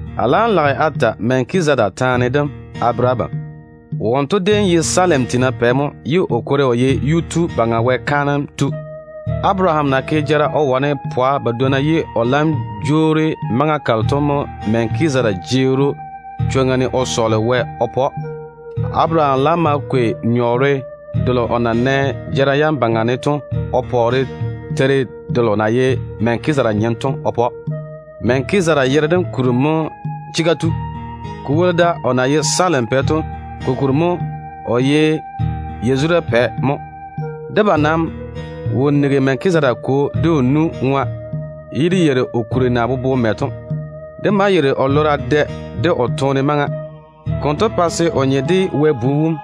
A laam lage a ta Melkizedeka taane dem a bere abam. Wonto déem ye Salem tiina pɛ mo ye o kwori o ye Yuu-tu Baŋa Wɛ kaanem tu. Abaraham na wane pwa badwonna jara wone ye o laam jwoori maŋa kalo to mo Melkizedeka jeeri‑o chwoŋa ne o sɔɔle Wɛ swolim o ke o yuu ne. Abaraham laam ma kwei nyɔɔre delo o na nɛ jara yam baŋa ne to o pɔɔre teiri delo na ye Melkizedeka nyem to o pa‑o. Melkizedeka yere dem kuri mo ye ‘Chega tu’. Ko woli da, o na ye Salem pɛ to, ko ta bere we o ye ‘Yazura pɛ’ mo. Debam nam wo nigi Melkizedeka kwo de o nu ŋwa, ye dé yeiri o kuri na bobo mɛ to. Dé maa yeiri o lora dɛ de o toone maŋa. Konto pa se o nye de Wɛ Bu wom,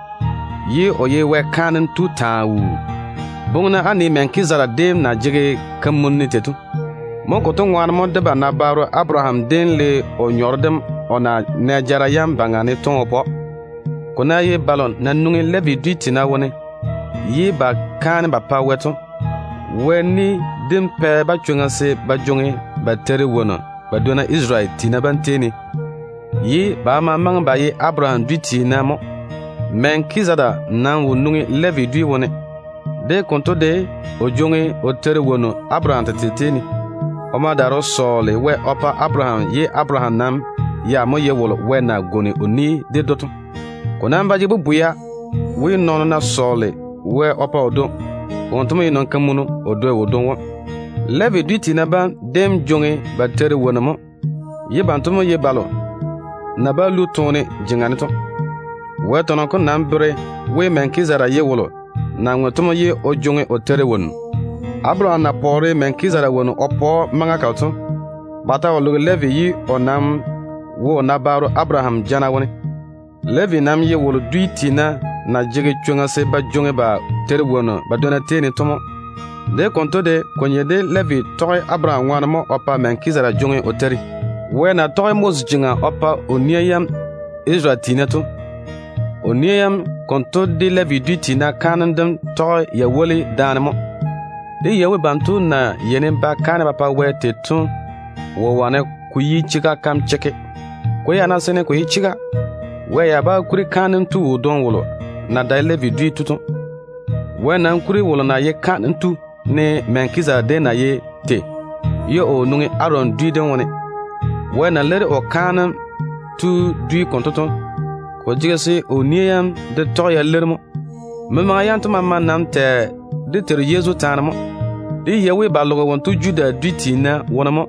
ye o ye Wɛ kaanem tu taa wuu. Boŋe-na á nii Melkizedeka déem na jege kamunim tei to. Konto ŋwaane mo debam nabaaro Abaraham déem le o nyɔɔre dem o na nɛ jara yam baŋa ne to o pa‑o. Ko ná ye balo na nwoŋi Levi dwi tiina wone ye ba kaane ba pa Wɛ to, Wɛ ni dem pɛ-ba chwoŋa se ba jwoŋi ba teiri wonnu ba dwonna Isarele tiina bam tei ne, ye ba maama maŋe ba ye Abaraham dwi tiina mo. Melkizedeka nam wo nwoŋi Levi dwi dem wone. De konto de, o jwoŋi o teiri wonnu Abaraham tete tei ne. O ma daare o sɔɔle Wɛ swolim o yage Abaraham yuu ne, ye Abaraham nam ya mo ye wolo Wɛ na pwooli kampwola ded‑o to. Ko nam ba jege bobwea we, nɔɔno ná sɔɔle Wɛ swolim o pa o dwoŋi, wonto mo ye nɔn-kamunu o dwoi wodwoŋi wom. Levi dwi tiina bam déem yeini ba jwoŋi ba teiri wonnu mo, ye banto mo ye balo na bá lu toone jeŋa ne to. Wɛ tɔnɔ kom nam bere we, Melkizedeka ye wolo na ŋwe to mo ye o jwoŋi o teiri wonnu. Abaraham na pɔɔre Melkizedeka wonnu o pa‑o maŋa kalo to, ba ta wo loge Levi ye o nam wo o nabaaro Abaraham jana wone. Levi nam ye wolo dwi tiina na jege chwoŋa se ba jwoŋi ba teiri wonnu ba dwonna tei ne to mo. De konto de, ko nye de Levi tɔge Abaraham ŋwaane mo o pa Melkizedeka jwoŋi o teiri wonnu. Wɛ na tɔge Moses jeŋa o pa o nia yam Isarele tiina bam to, o nia yam konto de Levi dwi tiina kaanem dem tɔge ya woli daane mo. Dé yei we banto na yeini ba ke kaanem ba pa Wɛ tei to wo wane ko yi chega kam chekke. Ko ya ná seene ko ye chega, Wɛ ya bá kuri kaanem tu wodwoŋi wolo na dae Levi dwi tu to. Wɛ nam kuri wolo na ye kaanem tu ne Melkizedeka déem na ye tei, ye o wo nwoŋi Aron dwi dem wone. Wɛ na leiri o kaanem tu dwi konto to, ko jege se o nia yam de tɔge ya leiri mo. Memaŋa yanto maama nam tɛ dé Teiru Yezu taane mo. Dé yei we ba loge wonto Judah dwi tiina wone mo,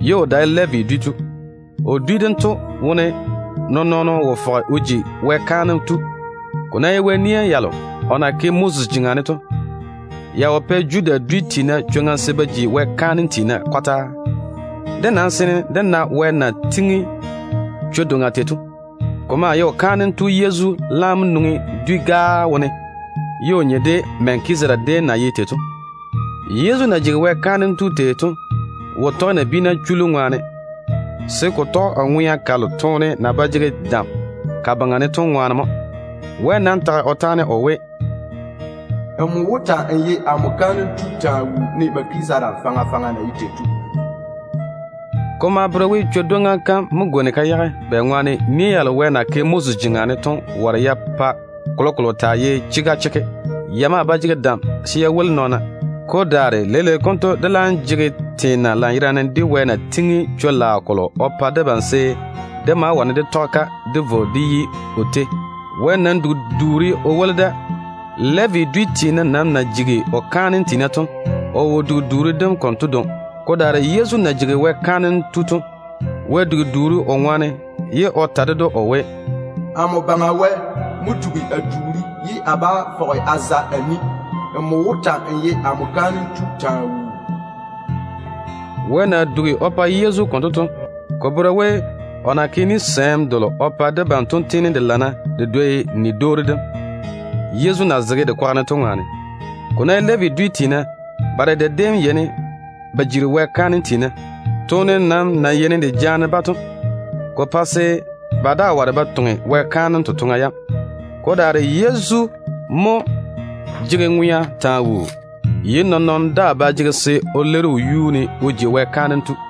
ye o dae Levi dwi tu. O dwi dento wone nɔɔn-nɔɔno wo fɔge o ji Wɛ kaanem tu. Ko ná ye Wɛ nia yalo o na ke Moses jeŋa ne to, ya wo pɛ Judah dwi tiina chwoŋa se ba ji Wɛ kaanem tiina kɔtaa. Dé nam seene dé lɔre Wɛ na tiŋi chwo-doŋa tei to. Ko maa ye o kaanem tu Yezu laam na nwoŋi dwi-gaa wone, ye o nye de Melkizedeka déem na ye tei to. Yezu na jigi Wɛ kaanem tu tei to wo tɔge nabiina chullu ŋwaane, se ko tɔge o ŋwea kalo toone na ba jege dam ka baŋa ne to ŋwaane mo. Wɛ nam tage o taane o we: “Nmo mo wó ta‑n ye amo kaanem tu taa wuu, ne Melkizedeka faŋa faŋa na ye tei to.” Ko maa bere we, chwo-dwoŋa kam mo gwoni ka yage, bɛŋwaane nia yalo Wɛ na ke Moses jeŋa ne to ware ya pa kolokolo taa ye chega chekke. Ya maa ba jege dam se ya woli nɔɔna. Ko daare leile konto dé laam jege teena lanyerane de Wɛ na tiŋi chwo-laao kolo o pa debam, se dé ma wane dé tɔge-ka dé vo dé yi o tei. Wɛ nam dugi duuri o woli da. Levi dwi tiina nam na jigi o kaanem tiina to, o wo dugi duuri dem konto dwoŋi. Ko daare Yezu na jigi Wɛ kaanem tu to, Wɛ dugi duuri o ŋwaane, ye o ta ded‑o o we: “Amo Baŋa Wɛ mo dugi a duuri ye a bá fɔge a za a ni. Nmo wó ta‑n ye amo kaanem tu taa wuu.” Wɛ na dugi duuri o pa Yezu konto to, ko bere we, o na ke ni-gwonim delo o pa debam to tiini de lana de dwoi o ni-dwoori dem, Yezu na zege dé kwaga ne to ŋwaane. Ko ná ye Levi dwi tiina bam, ba dedɛ déem yeini ba jiri Wɛ kaanem tiina. Toone nam na yeini de jaane-ba to, ko pɛ se ba daa ware ba toŋe Wɛ kaanem totoŋa yam. Ko daare Yezu mo jege ŋwea taa wuu, ye nɔɔn-nɔɔno daa ba jege se o leiri o yuu ne o ji Wɛ kaanem tu.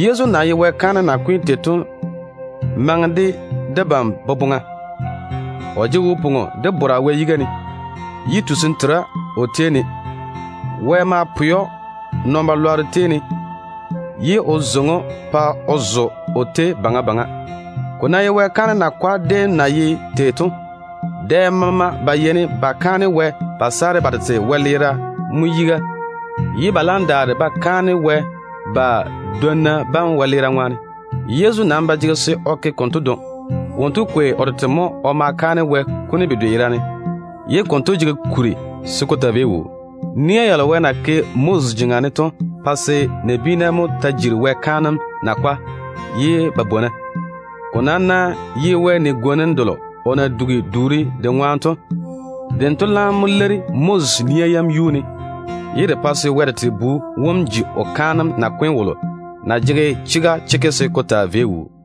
Yezu na ye Wɛ kaanem nakwe tu tei to maŋe de debam boboŋa. O jege wo-pwoŋo de chega Wɛ yiga ne, ye tusim tera o tei ne. Wɛ ma pwɛ‑o nɔn-chechɔgero tei ne, ye o daare o zeiŋi‑o pa o zo o tei wɛyuu baŋa seeni. Ko ná ye Wɛ kaanem yiga tiina déem na ye tei to, dɛ maama ba yeini ba da yiga ba kaane Wɛ ba ma saare ba tete wɛleera, ye ba laam daare ba kaane Wɛ ba dwonna bam wɛleera ŋwaane. Yezu nam ba jege se o ke konto dwoŋi. Wonto kwei o tete mo o ma kaane Wɛ kuni bedwe yerane, ye konto jege kuri se ko taa vei wuu. Nia yalo Wɛ na ke Moses jeŋa ne to pae se nabiina mo taa jiri Wɛ kaanem yiga tiina ye ba bwona. Ko nam ná ye Wɛ ni-gwonim delo o na dugi duuri de ŋwaane to, dento laam mo leiri Moses nia yam yuu ne, ye de pa se Wɛ tete Bu wom ji o kaanem nakwe tu wolo na jege chega chekke se ko taa vei wuu to.